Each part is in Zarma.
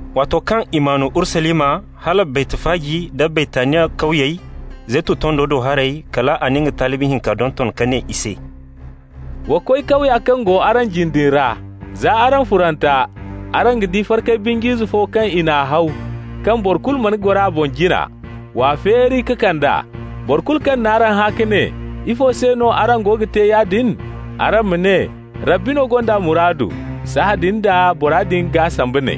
Waato kaŋ i maan Urusalima hala Baytfaji nda Baytaniya kawyey, Zeytun tondo do haray, kal a na nga talibi hinka donton, ka ne i se: «Wa koy kawya kaŋ go araŋ jine din ra. Za araŋ furanta, araŋ ga di farkay binj'ize fo kaŋ i n'a haw, kaŋ boro kulu mana goro a boŋ jina. W'a feeri ka kand'a. Boro kulu kaŋ n'araŋ hã ka ne: ‹Ifo se no araŋ go ga te yaadin?› araŋ ma ne: ‹Rabbi no gond'a muraadu.› Sahãadin d'a bora din g'a samba ne.»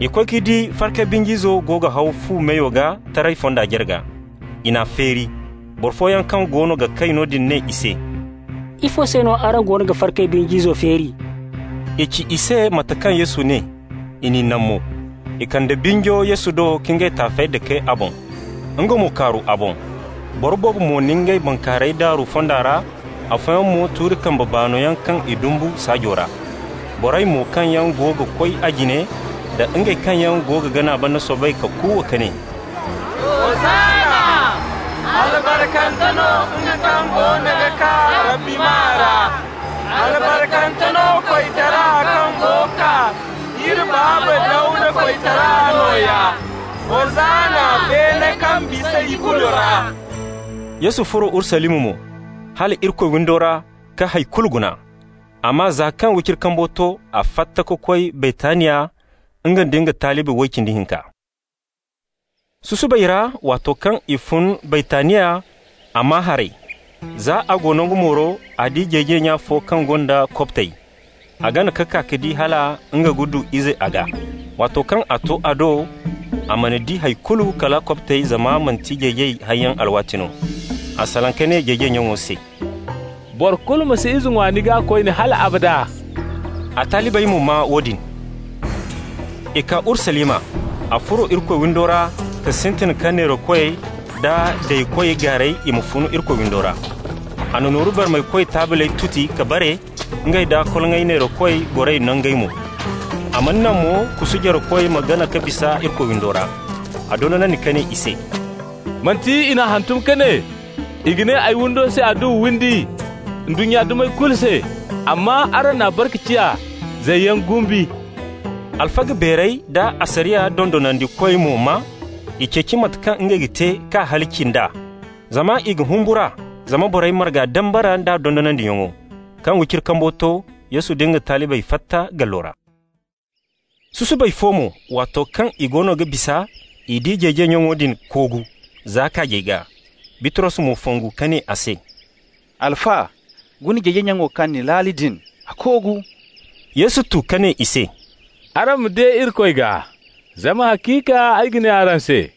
I koy ka di farkay binj'izo go ga haw fu meyo gaa taray fonda jarga. I n'a feeri. Boro fooyaŋ kaŋ goono ga kay noodin ne i se: «Ifo se no araŋ goono ga farkay binj'izo feeri?» I ci i se mate kaŋ Yesu ne, i n'i naŋ mo. I kande binjo Yesu do ka ngey taafey dake a boŋ. Nga mo kaaru a boŋ. Boro boobo mo na ngey bankaarayey daaru fonda ra, afooyaŋ mo tuuri kambe baano yaŋ kaŋ i dumbu saajo ra. Borey mo kaŋ yaŋ go ga koy a jine nda ngey kaŋ yaŋ go ga gana banda soobay ka kuuwa ka ne: «Hosanna!» «Albarkante no nga kaŋ goono ga kaa Rabbi maa ra!» «Albarkante no koytara kaŋ go kaa, iri baaba Dawda koytara nooya!» «Hosanna beene kaŋ bisa ikulu ra!» Yesu furo Urusalima mo, hala Irikoy windo ra, ka hay kulu guna. Amma za kaŋ wiciri kambo to, a fatta ka koy Baytaniya, nga nda nga talibi way cindi hinka. Susubay ra, waato kaŋ i fun Baytaniya, a maa haray. Za a go nangu mooro, a di jeejay nya fo kaŋ gonda kobtey. A gana ka kaa ka di hal nga ga du ize a gaa. Waato kaŋ a to a do, a mana di hay kulu kala kobtey, zama manti jeejay hayyaŋ alwaati no. A salaŋ ka ne jeejay nyaŋo se: «Boro kulu ma si ize ŋwa ni gaa koyne hal abada.» A talibey mo maa woodin. I kaa Urusalima. A furo Irikoy windo ra ka sintin ka neerakoy da daykoy gaaray i ma fun Irikoy windo ra. A na nooru barmaykoy taabley tuti ka bare, ngey da koloŋay neerakoy goray nangey mo. A mana naŋ mo kusu jarekoy ma gana ka bisa Irikoy windo ra. A dondonandi ka ne i se: «Manti i n'a hantum ka ne: ‹I ga ne ay windo se adduwa windi ndunnya dumey kulu se?› Amma araŋ n'a bare ka ciya ‹zayyaŋ guusu›.» Alfaga beerey da asariya dondonandikoy mo maa. I ceeci mate kaŋ ngey ga te k'a halaci nd'a, zama i ga humbur'a zama borey marga dambara nd'a dondonandiyaŋo. Kaŋ wiciri kambo to, Yesu nda nga talibey fatta gallo ra. Susubay fo mo, waato kaŋ i goono ga bisa, i di jeejay nyaŋo din koogu za kaajey gaa. Bitros mo fongu ka ne a se: «Alfa, guna jeejay nyaŋo kaŋ ni laali din, a koogu.» Yesu tu ka ne i se: «Araŋ ma de Irikoy gaa. Zama haciika ay ga ne araŋ se: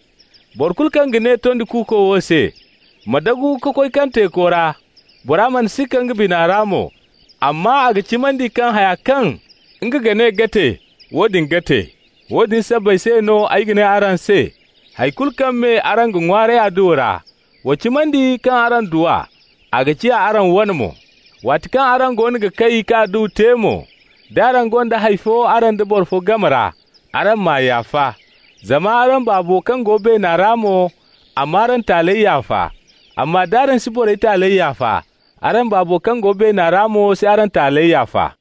boro kulu kaŋ ga ne tondi kuuko wo se: ‹Ma dagu ka koy kaŋ teeko ra,› bora mana sikka nga bina ra mo, amma a ga cimandi kaŋ haya kaŋ nga ga ne ga te, woodin ga te. Woodin sabbay se no ay ga ne araŋ se: hay kulu kaŋ me araŋ ga ŋwaaray adduwa ra, wa cimandi kaŋ araŋ du a, a ga ciya araŋ wane mo. Waati kaŋ araŋ goono ga kay ka adduwa te mo, d'araŋ gonda hay fo araŋ da boro fo game ra, araŋ m'a yaafa. Zama araŋ Baabo kaŋ go beena ra mo, a m'araŋ taaley yaafa. Amma d'araŋ si borey taaley yaafa, araŋ Baabo kaŋ go beena ra mo si araŋ taaley yaafa.»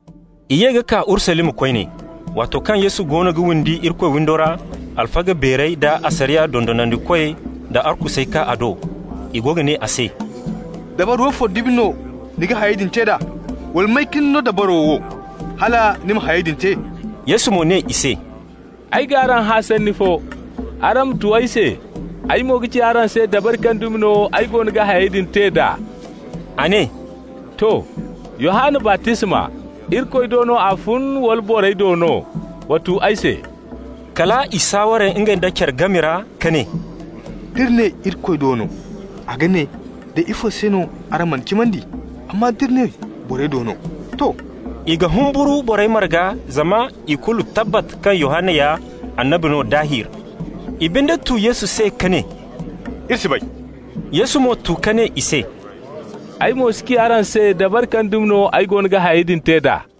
I ye ka kaa Urusalima koyne. Waato kaŋ Yesu goono ga windi Irikoy windo ra, alfaga beerey da asariya dondonandikoy da arkusey kaa a do. I go ga ne a se: «Dabari woofo dumi no ni ga hayey din te d'a? Wala may ka ni no dabaro wo hala ni ma hayey din te?» Yesu mo ne i se: «Ay g'araŋ hã sanni fo. Araŋ ma tu ay se, ay mo ga ci araŋ se dabari kaŋ dumi no ay goono ga hayey din te d'a.» A ne: «To, Yohanna baptisma, Irikoy do no a fun, wala borey do no? Wa tu ay se.» Kala i saaware ngey da care game ra ka ne: «D'iri ne: ‹Irikoy do no›, a ga ne: ‹Day ifo se no araŋ man'a cimandi?› Amma d'iri ne: ‹Borey do no›, to!» -- i ga humburu borey marga zama i kulu tabbat kaŋ Yohanna ya annabi no daahir. I binde tu Yesu se ka ne: «Iri si bay.» Yesu mo tu ka ne i se: «Ay mo si ci araŋ se dabari kaŋ dumi no ay goono ga hayey din te d'a.»